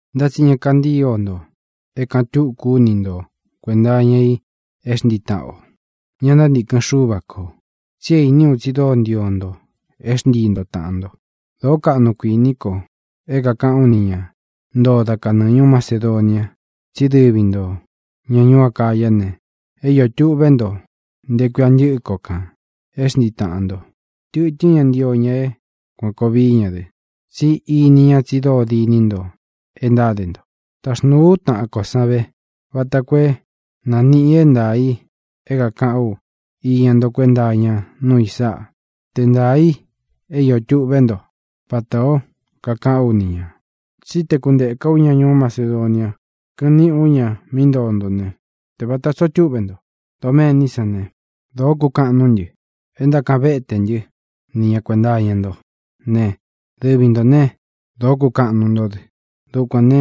Ntá tsi ña kantío nto é kāꞌan túku ú ni nto kuēnta iña i é xntii taꞌan ō, ña ntántīkɨn Xúva kō, tsi é īní u tsi dóo ntío nto é xntii nto tāꞌan nto. Dōó kaꞌnu kuīní ko é kākaꞌán u ni ña ntoo da kanɨɨ ñūú Macedonia tsí dɨvi ntō, ña ñuú Acayá ne, é iō tuꞌvé nto nte kuia ntɨ́ꞌɨ ko kān é xntii taꞌan ntō. Tɨ̄tɨ́n ña ntio ña é kuān koo vií ña dɨ, tsi íni ña tsi dóo diní nto e ntáde nto. Taxnūu ú taꞌan kō san ve, vata koo é nāniꞌi é ntaā i é kākaꞌán u iña nto kuenta iña núu i sáꞌa, te ntaā i é iō tuꞌvé nto, vatā ó kakaꞌán u ni ñā. Tsí te kūnteká u ña ñuú Macedonia, kɨꞌɨn niꞌi ú ña mí ntoo ntō ne, te vāta tsoo túꞌve nto doméní san ne, dōó kukaꞌan nuú ntɨ e ntákaꞌan vétē ntɨ́ ni ña kuēnta iña nto ne, dɨvi ntō né, dōó kukaꞌan nuu ntó dɨ. Dukuān ne,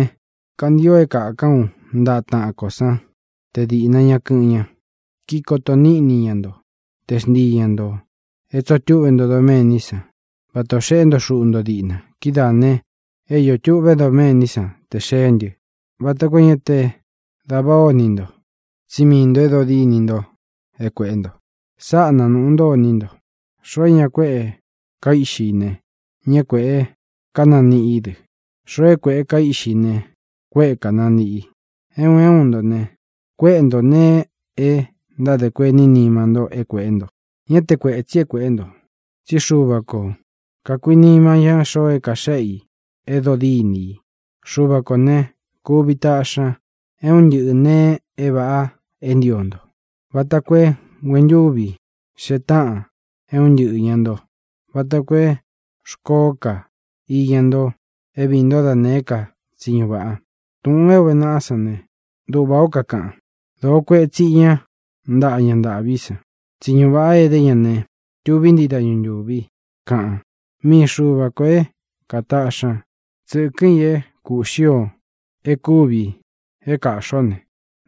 kantio é kākán u ntaꞌa taꞌan kō sán te diꞌna ña kɨ́ꞌɨn ña, kíkoto níꞌni ña nto te xntii ñā nto é tsōo túꞌvē nto doméní san vata ō xeꞌé nto xuꞌu nto díꞌna. Kidáā ne, é iō tuꞌvé doméní san tē xeé ntɨ, vata koo é ña te dava ó ini nto, tsí mii ntō e dóo diní nto é kuēꞌé nto. Sáꞌa nanūꞌu ntó iní nto: Xoo é ñā kueꞌe kaíꞌxi i ne, ñá kuēꞌe kánaniꞌí i dɨ; xoo é kuéꞌe kaíꞌxi i ne, kuéꞌe kānaniꞌí i. É un é un nto ne, kuéꞌe nto nēe e ntádē kuení nima nto é kuēꞌé nto; ñá te kuētsi é kueꞌé nto, tsí Xuva ko kakuīnima ña xoo é kaxéꞌe i é dodíni i. Xuva kō né, kuvi taꞌxi ña é un ntɨꞌɨ nēe é vāꞌa é ntio nto, vata koo é nguentúvi xee táꞌan é un ntɨꞌɨ īña nto, vata koo é xkōó ka iña nto é viī ntó da nēé ka tsiñu vāꞌa. Túꞌūn é ūve naꞌa sán ne, duꞌvā ó kakaꞌan: Dōo kueꞌe tsíꞌi ña ntaꞌa ña ntāꞌví san; tsiñu vāꞌa é edé ña ne, tuví ntii dañu ntūvi, kaꞌan. Mii Xuva kō é kātaꞌxi ña tsɨ́kɨ̄n i é kūꞌxí ō é kūvi é kāꞌxi ó ne,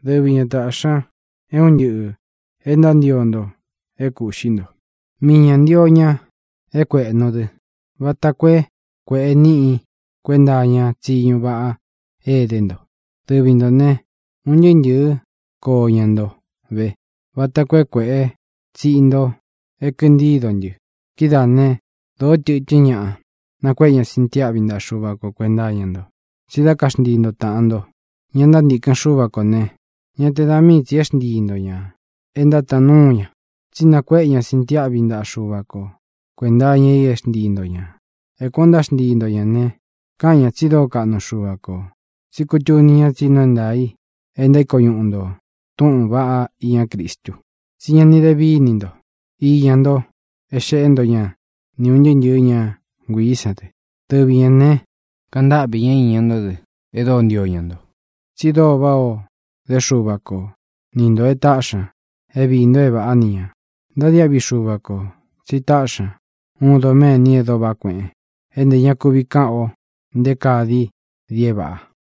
dɨvi ña tāꞌxi ña é un ntɨꞌɨ̄ e ntántio nto é kūꞌxi nto. Mii ñā ntio ña é kuēꞌnu dɨ́ vata koo é kuēꞌe níꞌi kuenta iña tsiñú vaꞌa é edé nto. Dɨvi ntō ne, un ntɨɨ́ ntɨ̄ɨ́ koo iña nto ve, vata koo é kuēꞌe tsiꞌi nto é kintído ntɨ. Kidáā né, dōó tɨtɨ́n ñaꞌa nakuéꞌe ña sintiáꞌvi ntaꞌa Xuva ko kuēnta iña nto. Tsi dá kaxntii nto tāꞌan nto, ña ntántīkɨn Xúva kō ne, ñá te da mii tsī é xntii nto ñā e ntátaan núu ña, tsí nakuéꞌe ña sintiáꞌvi ntaꞌa Xuva ko kuēnta iña i e xntíi nto ñā. É kuān ó ntáxntii nto ñā ne, káꞌan ña tsi dóo kaꞌnu Xuva kō, tsí kutuni ña tsí nuu é ntaā i é ntaíko ñuꞌu nto túꞌūn vaꞌá iña Cristu, tsi ñá ni de víni nto iña nto é xeꞌé nto ña ni ūn ntɨɨ́ ntɨ̄ɨ́ ña nguiī sán dɨ. Dɨvi ñā ne, kaꞌan ntáꞌvī ñá iña ntó dɨ e dóo ntio ña nto, tsi dóo váꞌā o dé Xuva ko ni ntō e táꞌxi ña é viī nto é vāꞌá ni ñā. ¡Ntadiáꞌvi Xuva kō tsi táꞌxi ña uun doméni e dóo vaꞌá kueꞌen, é ntē ña kuvi káꞌan ō nté kaa dií dií é vāꞌa!